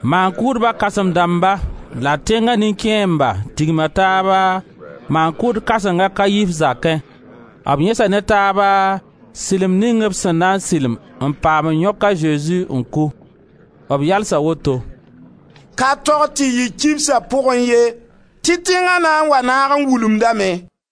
Maan-kʋʋdba kãsem dãmba la tẽnga nin-kẽemba tigma taaba maan-kʋʋd kãseng a Kaif zakẽ. B yẽsa ne taaba sɩlem ning b sẽn na n sɩlem n paam n yõk a Zezi n kʋ. B yalsa woto: «Ka tog tɩ yɩ kibsa pʋgẽ ye tɩ tẽnga na n wa naag n wulumdame.»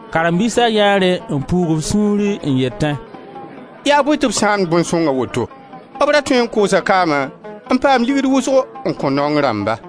Karen-biisa yãee rẽ n puug b sũuri n yetẽ: «Yaa bõe tɩ b sãamd bõn-sõng a woto? B ra tõe n koosa kaama n paam ligd wʋsgo n kõ naong rãmba.»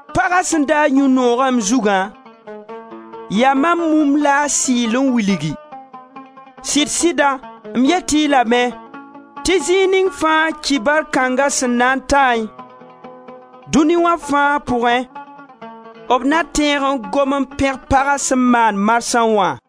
Paga sẽn daag yũ-noogã m zugã, yaa mam mumb la a sɩɩl n wilgi. Sɩd-sɩda m yet-y lame tɩ zĩig ning fãa kibar kãnga sẽn na n taẽ, dũni wã fãa pʋgẽ, b na tẽeg n gom n pẽg paga sẽn maam marsã wã.»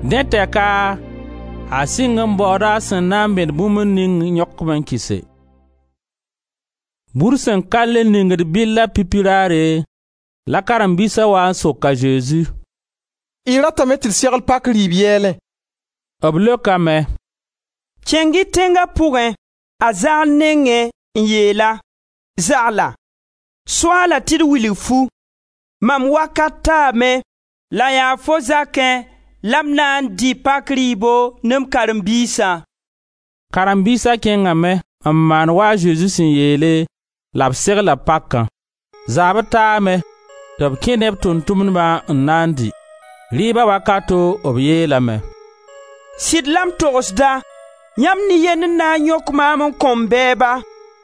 Dẽ tɛka a sɩng n baooda a sẽn na n bẽd bũmb ning n yõk-b n kɩse. Bur sẽn ka le ningd bɩlla pipi raare, la karen-biisa waa n sok a Zezi: «Y ratame tɩ d segl pak rɩɩb yɛɛlẽ?» B leokame: «Kẽng-y tẽnga pʋgẽ, a Zagl nengẽ n yeel-a: ‹Zagla, Soaala tɩ d wilg-fu: Mam wakat taame, la yaa fo zakẽ la m na dɩ pak rɩɩbo ne m karen-biisã.›» Karen-biisa kẽngame n maan wa a Zezi sẽn yeele la b segla pakã. Zaabr taame tɩ b kẽ ne b Tʋʋm-tʋmdbã n na n dɩ. Rɩɩba wakato b yeelame: «Sɩd la m togsda, yãmb nin-yend n na n yõk maam n kõ m bɛɛba.»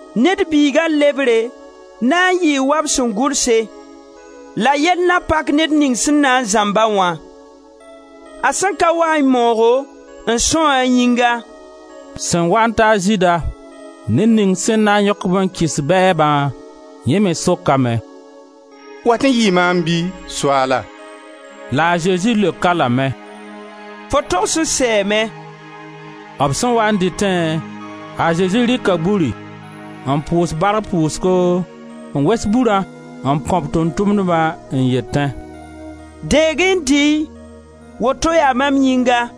Ned Biiga lebre na n yɩɩ wa b sẽn gʋlse la yell na pak ned ning sẽn na n zãmba wã. A sẽn ka waẽ moogo n sãoẽ a yĩnga!» Sẽn waa n ta a Zɩɩda, ned ning sẽn na n yõk-b n kɩs bɛɛbã, yẽ me sokame: «Wat n yɩɩ maam bɩ, Soaala?» La a Zezi leok-a lame: «Fo togs n sɛɛme.» B sẽn waa n dɩtẽ, a Zezi rɩka buri, n pʋʋs bark pʋʋsgo, n wes burã n kõ b Tʋʋm-tʋmdbã n yetẽ: «Deeg-y n dɩɩ-y, woto yaa mam yĩnga.»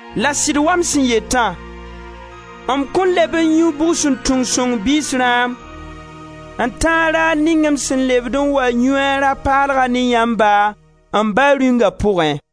La sɩd wa m sẽn yetã, m kõn leb n yũ bugsuntung sõng biis rãam n tãag raar ning m sẽn lebd n wa yũ a rã-paalgã ne yãmba, m Ba Rĩunga pʋgẽ.»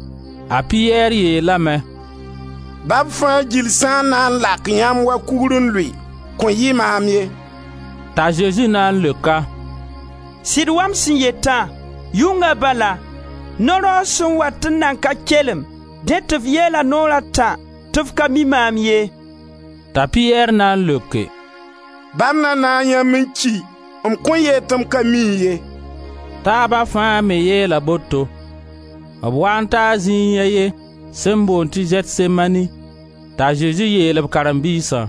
A Piyɛr yeelame: «Ba b fãa gill sã n na n lak yãmb wa kugr n lʋɩ, kõn yɩ maam ye.» T'a Zezi na n leok-a: «Sɩd wa m sẽn yetã, yʋnga bala, no-raoog sẽn wat n nan ka kelem dẽ tɩ f yeela naoor a tã tɩ f ka mi maam ye.» T'a Piyɛr na n leoke: «Ba m na naag yãmb n ki, m kõn yeel tɩ m ka mi-y ye.» Taaba fãa me yeela boto. B waa n taa zĩig a ye sẽn boond tɩ Zɛtsemani t'a Zezi yeel b karen-biisã: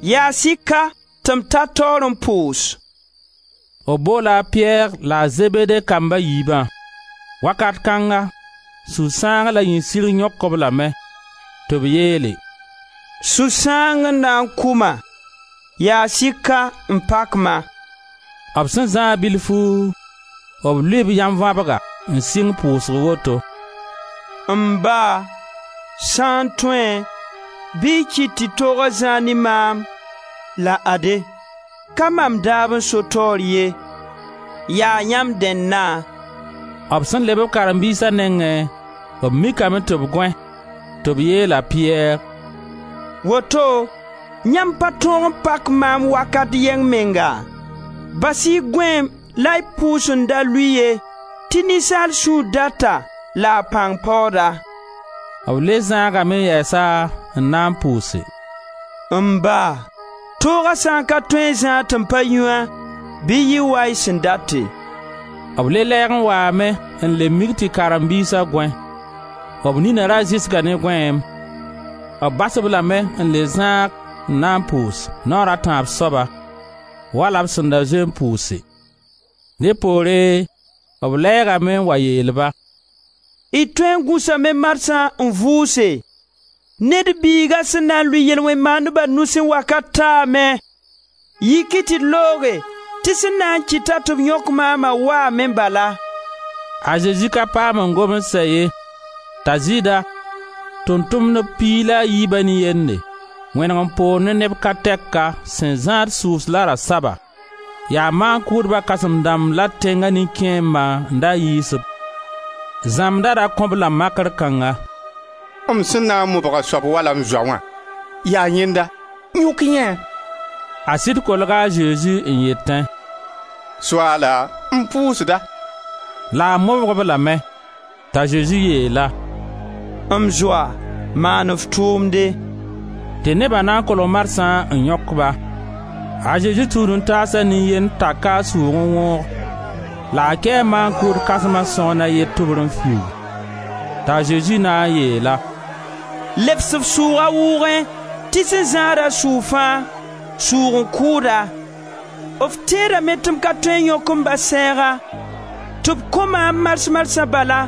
«Yaas-y ka tɩ m ta taoor n pʋʋs.» B boola a Piyɛr la a Zebede kamb a yiibã. Wakat kãnga sũ-sãang la yĩnsirg yõk-b lame, tɩ b yeele: «Sũ-sãang n na n kʋ-ma, yaas-y ka n pak-ma.» B sẽn zãag bilfu, b lʋɩɩ b yãnvabga n sɩng pʋʋsg woto: «M Ba, sã n tõe, bɩ y kɩt tɩ tooga zãag ne maam. La ade, ka mam daab n so taoor ye, yaa yãmb dẽnna.» B sẽn leb b karen-biisa nengẽ, b mikame tɩ b gõe, tɩ b yeel a Piyɛr: «Woto yãmb pa tõog n pak maam wakat yɛng menga? Bas-y gõeem la y pʋʋs n da lʋɩ ye tɩ ninsaal sũur data la a pãng paooda.» B le zãagame yɛsa n na n pʋʋse: «M Ba, tooga sã n ka tõe n zãag tɩ m pa yũ-a bɩ yɩ wa y sẽn date.» B le lɛɛg n waame n le mik tɩ karen-biisa gõe: b nina ra zɩsga ne gõeem. B bas-b lame n le zãag n na n pʋʋs, naoor a tãab soaba, wala b sẽn da zoe n pʋʋse. Dẽ poore b lɛɛgame n wa yeel-ba: «Y tõe n gũsame marsã, n vʋʋse. Ned Biiga sẽn na n lʋɩ yel-wẽn-maandba nusẽ wakat taame. Yik-y tɩ d looge tɩ sẽn na n kɩta tɩ b yõk maama waame bala!» A Zezi ka paam n gom n sɛ ye, t'a Zɩɩda, Tʋʋm-tʋmdb piig la a yiiba nin-yende, wẽneg n poog ne neb ka tɛka sẽn zãad sʋʋs la rasaba; yaa maan-kʋʋdba kãsem-dãmb la tẽnga nin-kẽembã n da yiis-b. Zãmbda ra kõ-b-la makr kãngã: «M sẽn na n mobg a soab wala m zoa wã, yaa yẽnda, yõk-y yẽe.» A sɩd kolga a Zezi n yetẽ: «Soaala, m pʋʋsda!» La a mobg-b lame, t'a Zezi yeel-a: «M zoa, maan f tʋʋmde.» Tɩ neba na n kolg marsã n yõk-ba. A Zezi tũud-n-taasa nin-yend taka a sʋʋg n wõog, la a kɛɛ maan-kʋʋd kãsma sõgen a ye tʋbre n fiuug. T'a Zezi na n yeel-a: «Lebs f sʋʋga a wʋʋgẽ tɩ sẽn zãada sʋʋg fãa, sʋʋg n kʋʋd-a. F tẽedame tɩ m ka tõe n yõk m Ba sɛɛga, tɩ b ko maam mars-marsã bala,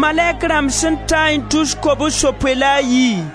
malɛk rãmb sẽn taẽ tus kobs-yopoe la a yi?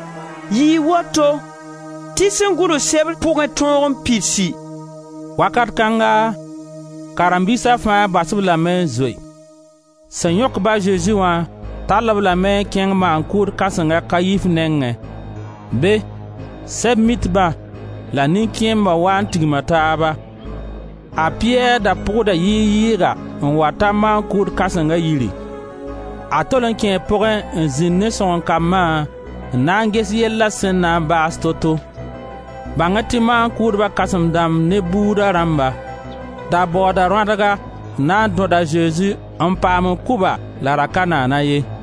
Yɩɩ woto tɩ sẽn gʋls Sebr pʋgẽ tõog n pidsi.» Wakat kãnga karen-biisa fãa bas-b lame n zoe. Sẽn yõk-ba a Zezi wã tall-b lame n kẽng maan-kʋʋd kãseng a Kayif nengẽ; be, Sɛb-mitba la nin-kẽembã waa n tigma taaba. A Piyɛr da pʋgda yɩɩg-yɩɩga n wa ta maan-kʋʋd kãsenga yiri; a tol n kẽe pʋgẽ n zĩnd ne sõgen-kambã n na n ges yella sẽn na n baas to-to. Bãng-y tɩ maan-kʋʋdba kãsem-dãmb ne bʋʋda rãmba da baooda rõadga n na n dõd a Zezi n paam n kʋ-ba la ra ka naana ye.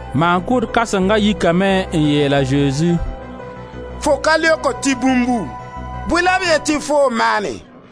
Maan-kʋʋd kãsenga yikame n yeel a Zezi: «Fo ka leokd tɩ bũmbu, bõe la b yet tɩ foo n maane?»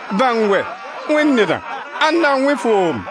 «Bãng wɛ, Wẽnd Nedã, ãnda n wẽ foom?»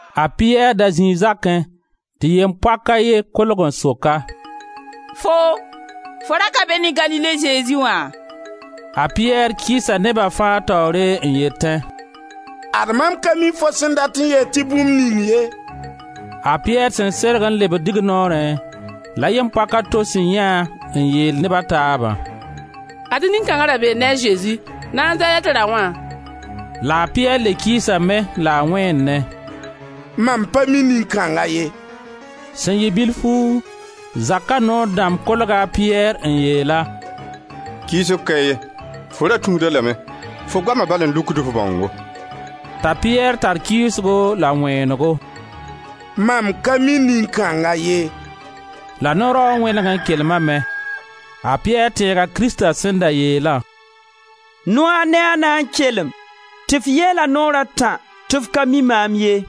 A Piyɛr da zĩi zakẽ tɩ yem-poak a ye kolg n sok-a: «Foo, fo ra ka be ne Galile Zezi wã?» A Piyɛr kɩɩsa neba fãa taoore n yetẽ: «Ad mam ka mi fo sẽn dat n yeel tɩ bũmb ning ye.» A Piyɛr sẽn serge n lebd dignoorẽ, la yem-poak a to sẽn yãe-a n yeel neb a taaba: «Ad-y nin-kãnga ra bee ne a Zezi, Nazarɛt Raoã.» La a Piyɛr le kɩɩsame la a wẽnnẽ: «Mam pa mi nin-kãnga ye.» Sẽn yɩ bilfu, zaka noor dãmb kolga a Piyɛr n yeel-a: «Kɩɩsg ka ye, fo ra tũud-a lame, fo goama bal n lukd f bãongo.» T'a Piyɛr tar kɩɩsgo la wẽenego: «Mam ka mi nin-kãnga ye.» La no-raoog wẽneg n kelmame. A Piyɛr tẽega Krista sẽn da yeelã: «Noaag ne a na n kelem tɩ f yeela naoor a tã tɩ f ka mi maam ye.»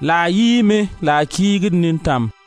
La a yiime la a kiigd nintãm.